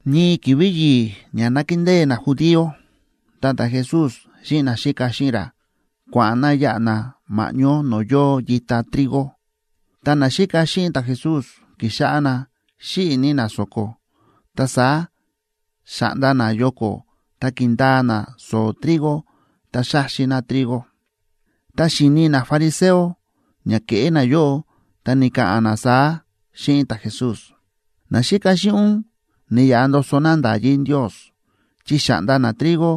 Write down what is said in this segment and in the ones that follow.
Ñii ki̱vi̱ yi̱i̱ ña nákindée najudío, ta ta̱Jesús xíꞌin naxíka xíꞌin ra kua̱ꞌa̱n na yáꞌa na ma̱ꞌñó no̱o̱ yóo yita trigo. Ta naxíka xíꞌin ta̱Jesús ki̱xáꞌá na xíꞌi̱ ní na so̱ko, ta saá xa̱ꞌnda na yoko̱ ta ki̱ndaa na so̱o̱ trigo, ta xa̱xi na trigo. Ta xi̱ni nafariseo ña ke̱ꞌé nayóꞌo, ta ni̱ka̱ꞌa̱n na saá xíꞌin ta̱Jesús: ―Naxíka xíꞌin ún ni̱yaꞌa ndoso na nda̱yí Ndios chi xa̱ꞌnda na trigo,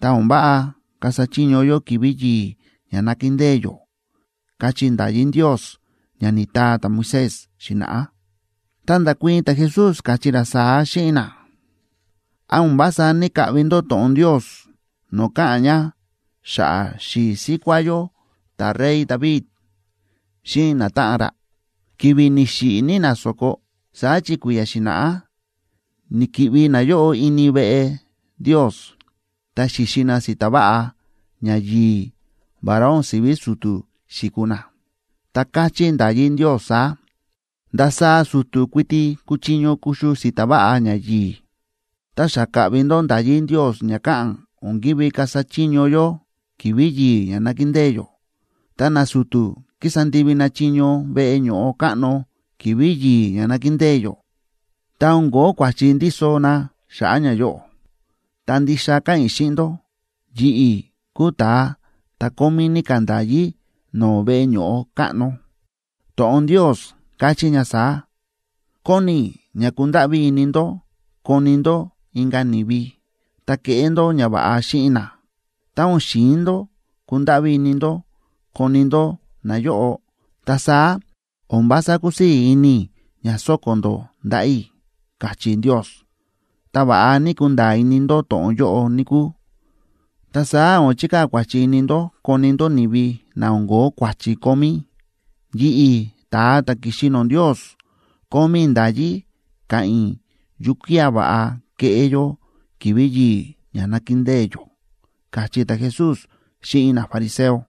ta o̱n váꞌa kasa chiño yó ki̱vi̱ yi̱i̱ ña nákindée yó, káchí nda̱yí Ndios ña ni̱taa ta̱Moisés xi̱na̱ꞌá. Ta nda̱kuii̱n ta̱Jesús, káchí ra saá xíꞌin na: ―¿Án o̱n vása ní‑kaꞌvi ndó to̱ꞌon Ndios no̱o̱ káꞌa̱n ña xa̱ꞌa̱ xi̱i̱ síkuá yó ta̱rey David xíꞌin natáꞌan ra, ki̱vi̱ ni̱xiꞌi̱ ní na so̱ko? Saá chi kui̱ya̱ xi̱na̱ꞌá ni̱ki̱ꞌvi nayóꞌo ini veꞌe Ndios, ta xi̱xi na si̱ta̱ váꞌa ñayi̱i̱ vará o̱n si̱ví su̱tu̱ xi̱kuu na. Ta káchí nda̱yí Ndios saá: “Ndasaá su̱tu̱ kuiti kúchiño kuxu si̱ta̱ váꞌa ñayi̱i̱.” Ta xa ka̱ꞌvi ndó nda̱yí Ndios ña káꞌa̱n o̱n ki̱ví kasa chiño yó ki̱vi̱ yi̱i̱ ña nákindée yó. Ta nasu̱tu̱ kísa ndivi na chiño veꞌe ño̱ꞌo káꞌno ki̱vi̱ yi̱i̱ ña nákindée yó, ta o̱n ko̱ó kua̱chi ndíso na xa̱ꞌa̱ ñayóꞌo. Ta ndixa káꞌa̱n i̱ xíꞌin ndó, yi̱ꞌi̱ kúu ta̱a ta̱ kómí ní ka̱ nda̱yí no̱o̱ veꞌe ño̱ꞌo káꞌno. To̱ꞌon Ndios káchí ña saá: “Kóni i̱ ña kundáꞌví ini ndó koni ndó inka̱ ni̱vi, ta keꞌé ndó ñava̱ꞌa xíꞌin na. Tá o̱n xi̱in ndó kundáꞌví ini ndó koni ndó nayóꞌo, ta saá o̱n vása kusii̱ ini i̱ ña so̱ko̱ ndó ndaꞌa̱ i̱”, káchí Ndios. Tá va̱ꞌa ná kunda̱a̱ ini ndó to̱ꞌon yóꞌo, níkúu, ta saá o̱n chikaa̱ kua̱chi ini ndó koni ndó ni̱vi na o̱n ko̱ó kua̱chi kómí. Yi̱ꞌi̱, ta̱a ta̱ ki̱xi no̱o̱ Ndios, kómí i̱ nda̱yí ka̱ꞌa̱n i̱ yukía̱ va̱ꞌa keꞌé yó ki̱vi̱ yi̱i̱ ña nákindée yó ―káchí ta̱Jesús xíꞌin nafariseo.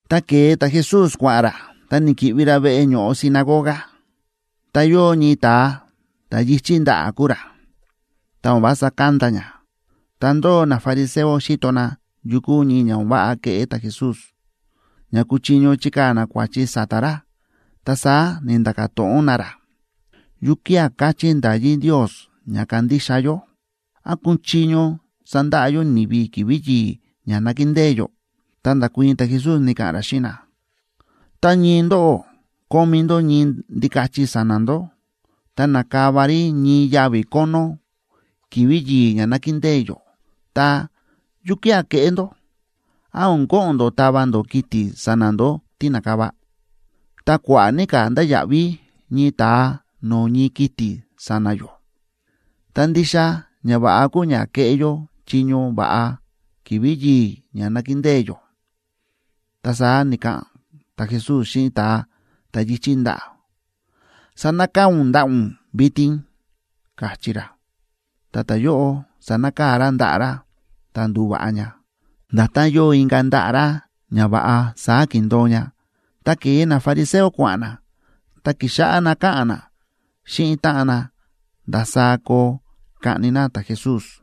Ta ke̱e ta̱Jesús kua̱ꞌa̱n ra, ta ni̱ki̱ꞌvi ra veꞌe ño̱ꞌo sinagoga. Ta yóo ñii ta̱a, ta̱ yi̱chí ndaꞌa̱ kúu ra, ta o̱n vása kánda ña. Ta ndóo nafariseo xíto na yu kúu ñii ña o̱n váꞌa keꞌé ta̱Jesús, ña kuchiño chikaa̱ na kua̱chi sa̱ta̱ ra. Ta saá ni̱nda̱ka̱ to̱ꞌon na ra: ―¿Yukía̱ káchí nda̱yí Ndios ña kándixa yó? ¿Án kúchiño sandaꞌa yó ni̱vi ki̱vi̱ yi̱i̱ ña nákindée yó? Ta nda̱kuii̱n ta̱Jesús, ni̱ka̱ꞌa̱n ra xíꞌin na: ―Tá ñii ndóꞌó kómí ndó ñii ndikachi sa̱na̱ ndó, ta nákava rí ñii yavi̱ kónó ki̱vi̱ yi̱i̱ ña nákindée yó, ta, ¿yukía̱ keꞌé ndó? ¿Án o̱n ko̱ꞌo̱n ndó tava ndó kiti̱ sa̱na̱ ndó tí na̱kava? ¡Ta kua̱ꞌa̱ ní ka̱ ndáya̱ꞌví ñii ta̱a no̱o̱ ñii kiti̱ sa̱na̱ yó! Ta ndixa ñava̱ꞌa kúu ña keꞌé yó chiño va̱ꞌa ki̱vi̱ yi̱i̱ ña nákindée yó. Ta saá ni̱ka̱ꞌa̱n ta̱Jesús xíꞌin ta̱a ta̱ yi̱chí ndaꞌa̱: ―Sanakaa̱ ún ndaꞌa̱ ún vitin ―káchí ra. Ta ta̱yóꞌo sa̱nakaa̱ ra ndaꞌa̱ ra, ta ndu̱va̱ꞌa ña. Nda̱tán yóo inka̱ ndaꞌa̱ ra ña va̱ꞌa, saá ki̱ndo̱o ña. Ta ke̱e nafariseo kua̱ꞌa̱n na, ta ki̱xáꞌá na káꞌa̱n na xíꞌin táꞌan na ndasaá koo kaꞌni na ta̱Jesús.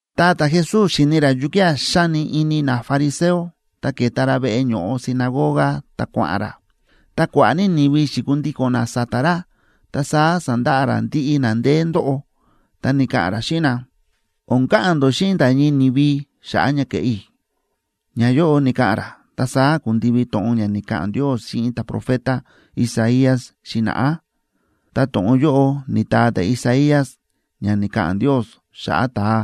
Ta ta̱Jesús xi̱ni̱ ra yukía̱ xáni ini nafariseo, ta ke̱ta ra veꞌe ño̱ꞌo sinagoga ta kua̱ꞌa̱n ra. Ta kua̱ꞌa̱ ní ni̱vi xi̱kundíko̱n na sa̱ta̱ ra, ta saá sa̱ndaꞌa ra ndiꞌi na ndeé ndóꞌo. Ta ni̱ka̱ꞌa̱n ra xíꞌin na: ―O̱n ka̱ꞌa̱n ndó xíꞌin nda̱ ñii ni̱vi xa̱ꞌa̱ ña kéꞌé i̱. Ñayóꞌo ni̱ka̱ꞌa̱n ra, ta saá ku̱ndivi to̱ꞌon ña ni̱ka̱ꞌa̱n Ndios xíꞌin ta̱profeta Isaías xi̱na̱ꞌá. Ta to̱ꞌon yóꞌo ni̱taa ta̱Isaías ña ni̱ka̱ꞌa̱n Ndios xa̱ꞌa̱ ta̱a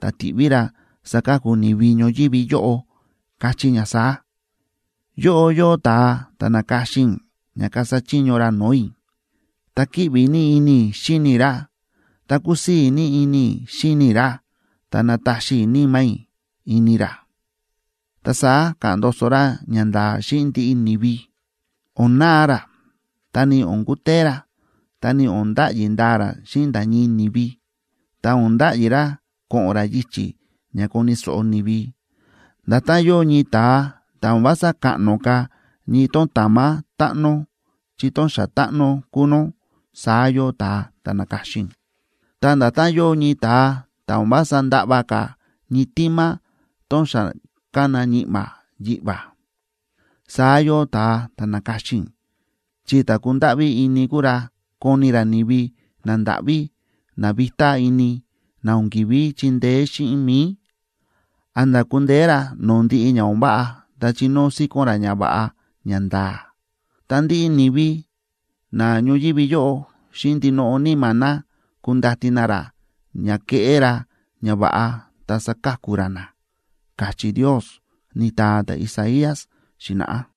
ta̱ tiꞌví ra saka̱ku ni̱vi ñoyívi yóꞌo, káchí ña saá: Yóꞌo yóo ta̱a ta̱ na̱ka̱xin i̱ ña kasa chiño ra no̱o̱ i̱, ta kíꞌvi ní ini i̱ xíni i̱ ra, ta kúsii̱ ní ini i̱ xíni i̱ ra. Ta nataxi i̱ Níma̱ i̱ ini ra, ta saá ka̱ꞌa̱n ndoso ra ñanda̱a̱ xíꞌin ndiꞌi ni̱vi. O̱n na̱a ra, ta ni o̱n kutee ra, ta o̱n nda̱ꞌyi ndaa ra xíꞌin nda̱ ñii ni̱vi. Ta o̱n nda̱ꞌyi ra ko̱ꞌo̱n ra yichi̱ ña koni̱ so̱ꞌo ni̱vi. Nda̱tán yóo ñii ta̱a ta̱ o̱n vása kaꞌno ka̱ ñii tón tamá táꞌno chi tón xa táꞌno kúu nó, saá yóo ta̱a ta̱ na̱ka̱xin i̱, ta nda̱tán yóo ñii ta̱a ta̱ o̱n vása ndaꞌva ka̱ ñii tima tón xa kána ñi̱ꞌma̱ yiꞌva̱, saá yóo ta̱a ta̱ na̱ka̱xin i̱, chi ta̱ kundáꞌví ini kuu ra koni ra ni̱vi nandáꞌví na vitá ini, na o̱n ki̱ví chindeé xíꞌin mi̱i, a̱nda̱ kundeé ra no̱o̱ ndiꞌi ña o̱n váꞌa ta chinóo síkón ra ñava̱ꞌa ñanda̱a̱. Ta ndiꞌi ni̱vi na ñoyívi yóꞌo xíꞌin ndinoꞌo níma̱ na kundati na ra ña keꞌé ra ñava̱ꞌa ta saka̱ku ra na, káchí Ndios, ni̱taa ta̱Isaías xi̱na̱ꞌá.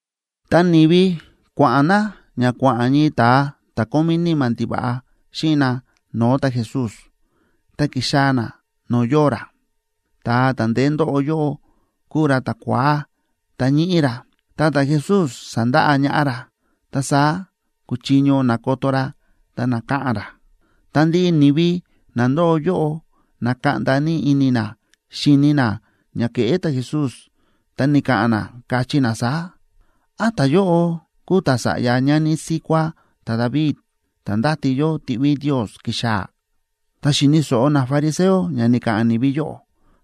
Ta ni̱vi kua̱ꞌa̱n na ña kua̱ꞌa̱n ñii ta̱a ta̱ kómí níma̱ ndiva̱ꞌa xíꞌin na no̱o̱ ta̱Jesús, ta ki̱xaa̱ na no̱o̱ yóo ra. Ta̱a ta̱ ndeé ndóꞌo yóꞌo kúu ra ta̱kua̱á ta ñíꞌí ra, ta ta̱Jesús sa̱ndaꞌa ñaꞌá ra, ta saá kúchiño nakoto ra ta naka̱ꞌa̱n ra. Ta ndiꞌi ni̱vi na ndóo yóꞌo na̱kaꞌnda ní ini na xíni na ña ke̱ꞌé ta̱Jesús, ta ni̱ka̱ꞌa̱n na, káchí na saá: ―¿Án ta̱yóꞌo kúu ta̱sa̱ꞌya ñani síkuá ta̱David, ta̱ ndáti yó tiꞌví Ndios kixaa̱? Ta xi̱ni̱ so̱ꞌo nafariseo ña ni̱ka̱ꞌa̱n ni̱vi yóꞌo,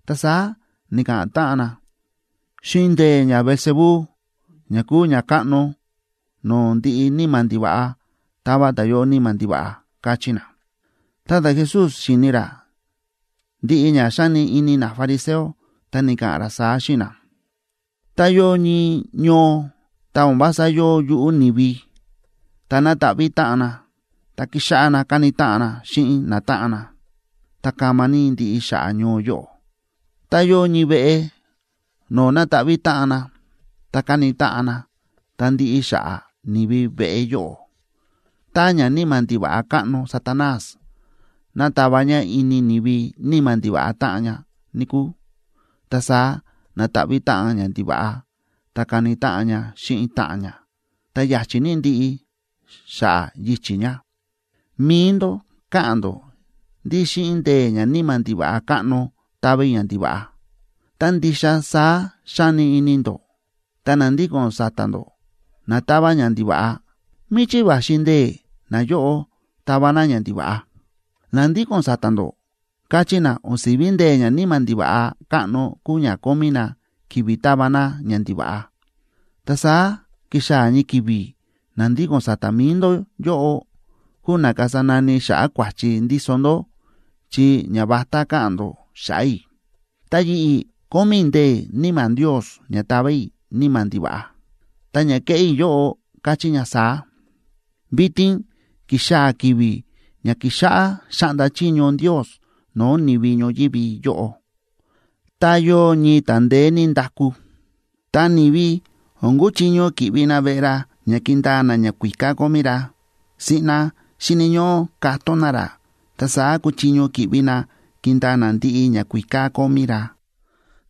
ta saá ni̱ka̱ꞌa̱n táꞌan na: ―Xíꞌin ndee̱ ñaBeelzebú,a ña kúu ñakáꞌno no̱o̱ ndiꞌi níma̱ ndiva̱ꞌa, táva ta̱yóꞌo níma̱ ndiva̱ꞌa ―káchí na. Ta ta̱Jesús xíni̱ ra ndiꞌi ña xáni ini nafariseo, ta ni̱ka̱ꞌa̱n ra saá xíꞌin na: ―Tá yóo ñii ñoo, ta o̱n vása yóo yuꞌú ni̱vi, ta na̱taꞌví táꞌan na, ta ki̱xáꞌá na káni táꞌan na xíꞌin natáꞌan na, ta kama ní ndiꞌi xa̱ꞌa̱ ñoo yóꞌo. Tá yóo ñii veꞌe no̱o̱ na̱taꞌví táꞌan na, ta káni táꞌan na, ta ndiꞌi xa̱ꞌa̱ ni̱vi veꞌe yóꞌo. Tá ñaníma̱ ndiva̱ꞌa káꞌno Satanás nátava ña ini ni̱vi níma̱ ndiva̱ꞌa táꞌan ña, níkúu, ta saá na̱taꞌví táꞌan ñandiva̱ꞌa ta káni táꞌan ña xíꞌin táꞌan ña, ta ya̱chi̱ ní ndiꞌi xa̱ꞌa̱ yichi̱ ña. Mi̱i ndó káꞌa̱n ndó ndí xíꞌin ndee̱ ñaníma̱ ndiva̱ꞌa káꞌno táva i̱ ñandiva̱ꞌa. Tá ndixa saá xáni ini ndó, ta na ndíko̱n sa̱ta̱ ndó na táva ñandiva̱ꞌa, ¿míchí va̱xi ndee̱ nayóꞌo táva na ñandiva̱ꞌa? Na ndíko̱n sa̱ta̱ ndó kachí na o̱n si̱ví ndee̱ ñaníma̱ ndiva̱ꞌa káꞌno kúu ña kómí na kivi tava na ñandiva̱ꞌa. Ta saá kixaa̱ ñii ki̱vi̱ na ndíko̱n sa̱ta̱ mi̱i ndó yóꞌo kuu na kasa nani xa̱ꞌa̱ kua̱chi ndíso ndó chi ñavatá káꞌa̱n ndó xa̱ꞌa̱ i̱. Ta yi̱ꞌi̱, kómí i̱ ndee̱ Níma̱ Ndios ña tava i̱ níma̱ ndiva̱ꞌa, ta ña kéꞌé i̱ yóꞌo káchí ña saá: vitin ki̱xaa̱ ki̱vi̱ ña kíxáꞌá xáꞌnda chiño Ndios no̱o̱ ni̱vi ñoyívi yóꞌo. ’Ta yóo ñii ta̱a ndeé ní ndaku, ta ni̱vi o̱n kuchiño ki̱ꞌvi na veꞌe ra ña kindaa na ñakuíká kómí ra. Siꞌna xíni̱ ñóꞌó katón na ra, ta saá kuchiño ki̱ꞌvi na kindaa na ndiꞌi ñakuíká kómí ra.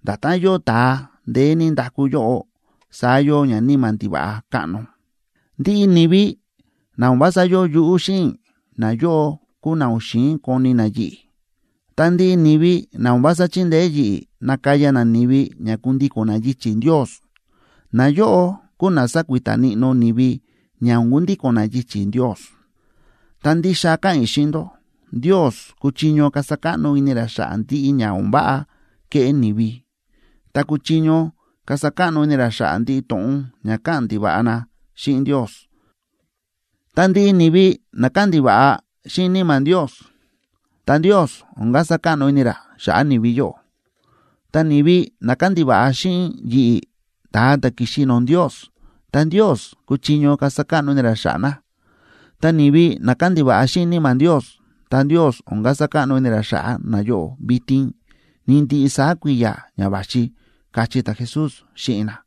Nda̱tán yóo ta̱a ndeé ní ndaku yóꞌo, saá yóo ñaníma̱ ndiva̱ꞌa káꞌno. ’Ndiꞌi ni̱vi na o̱n vása yóo yuꞌú xíꞌin i̱, nayóꞌo kúu na o̱n xi̱in koni na yi̱ꞌi̱. Ta ndiꞌi ni̱vi na o̱n vása chíndeé yi̱ꞌi̱ nakaya na ni̱vi ña kundíko̱n na yichi̱ Ndios, nayóꞌo kúu na sákuita níꞌnó ni̱vi ña o̱n kundíko̱n na yichi̱ Ndios. ’Ta ndixa káꞌa̱n i̱ xíꞌin ndó, Ndios kúchiño kasa káꞌno ini ra xa̱ꞌa̱ ndiꞌi ña o̱n váꞌa kéꞌé ni̱vi, ta kúchiño kasa káꞌno ini ra xa̱ꞌa̱ ndiꞌi to̱ꞌon ña káꞌa̱n ndiva̱ꞌa na xíꞌin Ndios. Ta ndiꞌi ni̱vi na káꞌa̱n ndiva̱ꞌa xíꞌin Níma̱ Ndios,b ta Ndios o̱n kasa káꞌno ini ra xa̱ꞌa̱ ni̱vi yóꞌo. Ta ni̱vi na káꞌa̱n ndiva̱ꞌa xíꞌin yi̱ꞌi̱, ta̱a ta̱ ki̱xi no̱o̱ Ndios, ta Ndios kúchiño kasa káꞌno ini ra xa̱ꞌa̱ na. Ta ni̱vi na káꞌa̱n ndiva̱ꞌa xíꞌin Níma̱ Ndios, ta Ndios o̱n kasa káꞌno ini ra xa̱ꞌa̱ nayóꞌo vitin, ni ndiꞌi saá kui̱ya̱ ña va̱xi ―káchí ta̱Jesús xíꞌin na.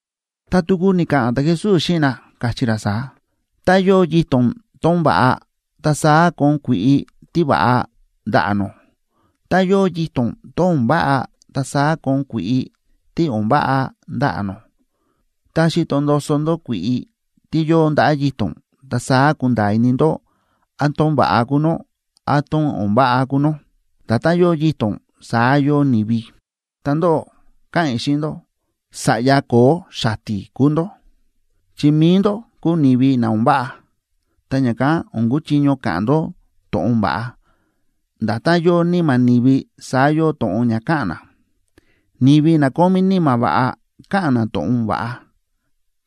Ta tuku ni̱ka̱ꞌa̱n ta̱Jesús xíꞌin na, káchí ra saá: ―Tá yóo yito̱n tón va̱ꞌa, ta saá kóon kui̱ꞌi tíva̱ꞌa ndaꞌa̱ nó. Tá yóo yito̱n tón o̱n váꞌa, ta saá kóon kui̱ꞌi tí o̱n váꞌa ndaꞌa̱ nó. Tá xíto ndoso ndó kui̱ꞌi tí yóo ndaꞌa̱ yito̱n, ta saá kunda̱a̱ ini ndó án tón va̱ꞌa kúu nó, án tón o̱n váꞌa kúu nó. Nda̱tán yóo yito̱n, saá yóo ni̱vi. Ta ndóꞌó, káꞌa̱n i̱ xíꞌin ndó, ¡sa̱ꞌya ko̱o̱ xati̱ kúu ndó! Chi mi̱i ndó kúu ni̱vi na o̱n váꞌa, ta ña̱kán o̱n kuchiño ka̱ꞌa̱n ndó to̱ꞌon va̱ꞌa. Nda̱tán yóo níma̱ ni̱vi, saá yóo to̱ꞌon ña káꞌa̱n na. Ni̱vi na kómí níma̱ va̱ꞌa, káꞌa̱n na to̱ꞌon va̱ꞌa.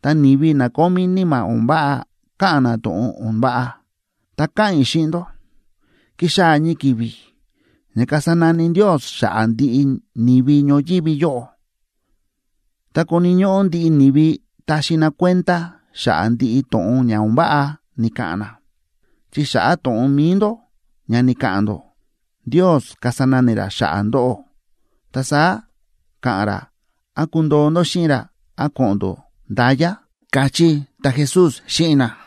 Ta ni̱vi na kómí níma̱ o̱n váꞌa, káꞌa̱n na to̱ꞌon o̱n váꞌa. Ta káꞌa̱n i̱ xíꞌin ndó, kixaa̱ ñii ki̱vi̱ ña kasa nani Ndios xa̱ꞌa̱ ndiꞌi ni̱vi ñoyívi yóꞌo, ta koni̱ ñóꞌó ndiꞌi ni̱vi taxi na kuenda xa̱ꞌa̱ ndiꞌi to̱ꞌon ña o̱n váꞌa ni̱ka̱ꞌa̱n na. Chi xa̱ꞌa̱ to̱ꞌon mi̱i ndó ña ni̱ka̱ꞌa̱n ndó, Ndios kasa nani ra xa̱ꞌa̱ ndóꞌó, ta saá ka̱ꞌa̱n ra án kundoo ndó xíꞌin ra, án ko̱ꞌo̱n ndó nda̱ya ―káchí ta̱Jesús xíꞌin na.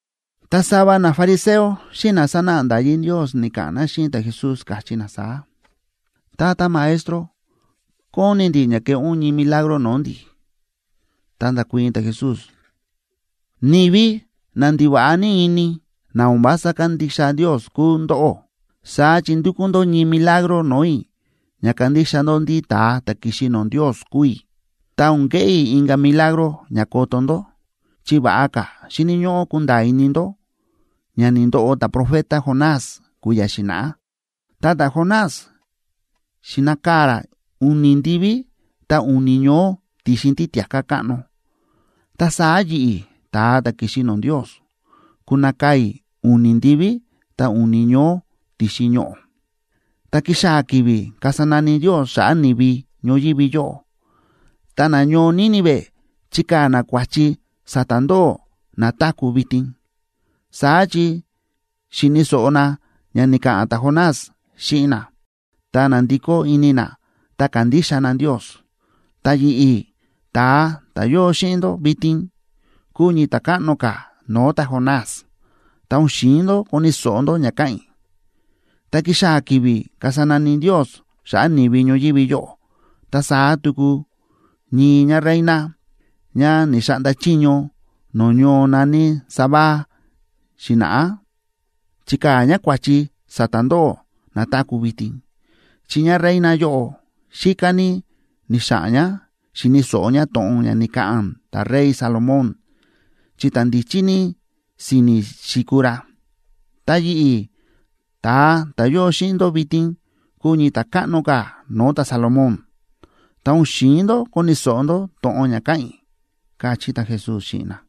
Ta sava nafariseo xíꞌin na sánáꞌa nda̱yí Ndios ni̱ka̱ꞌa̱n na xíꞌin ta̱Jesús, káchí na saá: ―Tata Maestro, kóni ndi̱ ña keꞌé ún ñii milagro no̱o̱ ndi̱. Ta nda̱kuii̱n ta̱Jesús: ―¡Ni̱vi na ndiva̱ꞌa ní ini, na o̱n vása kándixa Ndios kúu ndóꞌó! Saá chi ndúkú ndó ñii milagro no̱o̱ i̱ ña kandixa ndó ndí ta̱a ta̱ ki̱xi no̱o̱ Ndios kúu i̱. Ta o̱n keꞌé i̱ inka̱ milagro ña koto ndó, chi va̱ꞌa ka̱ xíni̱ ñóꞌó kunda̱a̱ ini ndó ña ni̱ndoꞌo ta̱profeta Jonás kui̱ya̱ xi̱na̱ꞌá. Ta ta̱Jonás xi̱nakaa̱ ra u̱ni̱ ndiví, ta u̱ni̱ ñoó ti̱xin títia̱ká káꞌno. Ta saá yi̱ꞌi̱, ta̱a ta̱ ki̱xi no̱o̱ Ndios, kunakaa̱ i̱ u̱ni̱ ndiví, ta u̱ni̱ ñoó ti̱xin ñoꞌo̱. Tá kixaa̱ ki̱vi̱ kasa nani Ndios xa̱ꞌa̱ ni̱vi ñoyívi yóꞌo, ta nañoo Nínive chikaa̱ na kua̱chi sa̱ta̱ ndóꞌó na táku̱ vitin. Saá chi xi̱ni̱ so̱ꞌo na ña ni̱ka̱ꞌa̱n ta̱Jonás xíꞌin na, ta na̱ndikó ini na ta ka̱ndixa na Ndios. Ta yi̱ꞌi̱, ta̱a ta̱ yóo xíꞌin ndó vitin, kúu ñii ta̱ káꞌno ka̱ no̱o̱ ta̱Jonás, ta o̱n xi̱in ndó koni̱ so̱ꞌo ndó ña káꞌa̱n i̱. Tá kixaa̱ ki̱vi̱ kasa nani Ndios xa̱ꞌa̱ ni̱vi ñoyívi yóꞌo, ta saá tuku ñii ñáreina, ñá ni̱xaꞌnda chiño no̱o̱ ñoo na̱ní Sabá xi̱na̱ꞌá, chikaa̱ ñá kua̱chi sa̱ta̱ ndóꞌó na táku̱ vitin. Chi ñáreina yóꞌo xíká ní ni̱xa̱ꞌa̱n ñá xi̱ni̱ so̱ꞌo ñá to̱ꞌon ña ni̱ka̱ꞌa̱n ta̱rey Salomón, chi ta̱ ndíchí ní si̱ni̱ xi̱kuu ra. Ta yi̱ꞌi̱, ta̱a ta̱ yóo xíꞌin ndó vitin, kúu ñii ta̱ káꞌno ka̱ no̱o̱ ta̱Salomón, ta o̱n xi̱in ndó koni̱ so̱ꞌo ndó to̱ꞌon ña káꞌa̱n i̱ ―káchí ta̱Jesús xíꞌin na.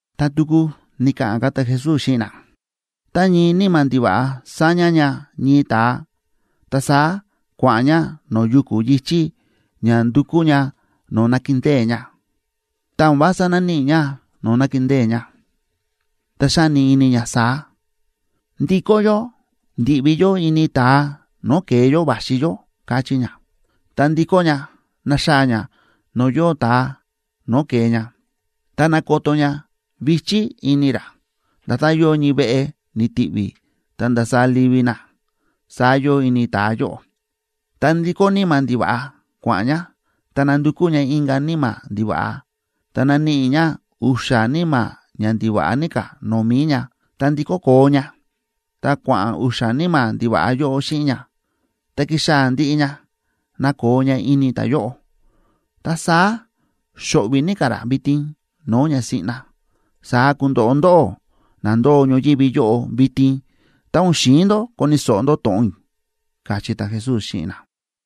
Ta tuku ni̱ka̱ꞌa̱n ta̱Jesús xíꞌin na: ―Tá ñii níma̱ ndiva̱ꞌa sáña ña ñii ta̱a, ta saá kua̱ꞌa̱n ña no̱o̱ yuku̱ yi̱chí ña nandukú ña no̱o̱ nakindée ña. Tá o̱n vása náníꞌi ña no̱o̱ nakindée ña, ta xáni ini ña saá: “Ndikó yó ndi̱ꞌvi yó ini ta̱a no̱o̱ ke̱e yó va̱xi yó”, káchí ña. Ta ndíkó ña, náxaa̱ ña no̱o̱ yóo ta̱a no̱o̱ ke̱e ña, ta nákoto ña vi̱chí ini ra. Nda̱tán yóo ñii veꞌe ni̱ti̱ví ta nda̱sa livi na, saá yóo ini ta̱a yóꞌo. Ta ndíkó níma̱ ndiva̱ꞌa kua̱ꞌa̱n ña, ta nándukú ña inka̱ níma̱ ndiva̱ꞌa, ta náníꞌi ña u̱xa̱ níma̱ ña ndiva̱ꞌa ní ka̱ no̱o̱ mi̱i ña. Ta ndíkó koo ña, ta kua̱ꞌa̱n u̱xa̱ níma̱ ndiva̱ꞌa yóꞌo xíꞌin ña, ta kíxaa̱ ndiꞌi ña nakoo ña ini ta̱a yóꞌo. Ta saá xóꞌvi̱ ní ka̱ ra vitin no̱o̱ ña siꞌna. Saá kundoꞌo ndóꞌó na ndóo ñoyívi yóꞌo vitin tá o̱n xi̱in ndó koni̱ so̱ꞌo ndó to̱ꞌon i̱ ―káchí ta̱Jesús xíꞌin na.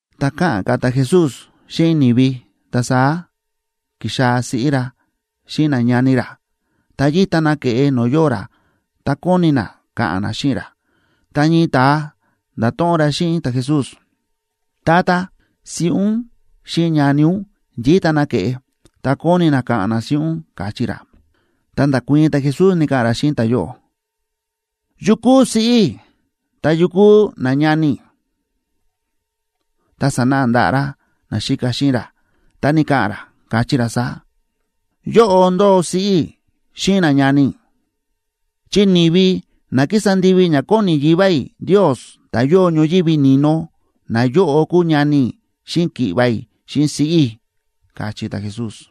Tá káꞌa̱n ka̱ ta̱Jesús xíꞌin ni̱vi, ta saá ki̱xaa̱ siꞌí ra xíꞌin nañani ra, ta yíta na ke̱ꞌe no̱o̱ yóo ra, ta kóni na ka̱ꞌa̱n na xíꞌin ra. Ta ñii ta̱a nda̱to̱ꞌon ra xíꞌin ta̱Jesús: ―Tata, siꞌí ún xíꞌin nañani ún yíta na ke̱ꞌe, ta kóni na ka̱ꞌa̱n na xíꞌin ún ―káchí ra. Ta nda̱kuii̱n ta̱Jesús, ni̱ka̱ꞌa̱n ra xíꞌin ta̱yóꞌo: ―¿Yu kúu siꞌí i̱? ¿Ta yu kúu nañani i̱? Ta sa̱náꞌa ndaꞌa̱ ra naxíka xíꞌin ra, ta ni̱ka̱ꞌa̱n ra, káchí ra saá: ―Yóꞌo ndóo siꞌí i̱ xíꞌin nañani i̱. Chi ni̱vi na kísa ndivi ña kóni Yivá i̱ Ndios, ta̱ yóo ñoyívi ni̱no, nayóꞌo kúu ñani i̱ xíꞌin ki̱ꞌva̱ i̱ xíꞌin siꞌí i̱ ―káchí ta̱Jesús.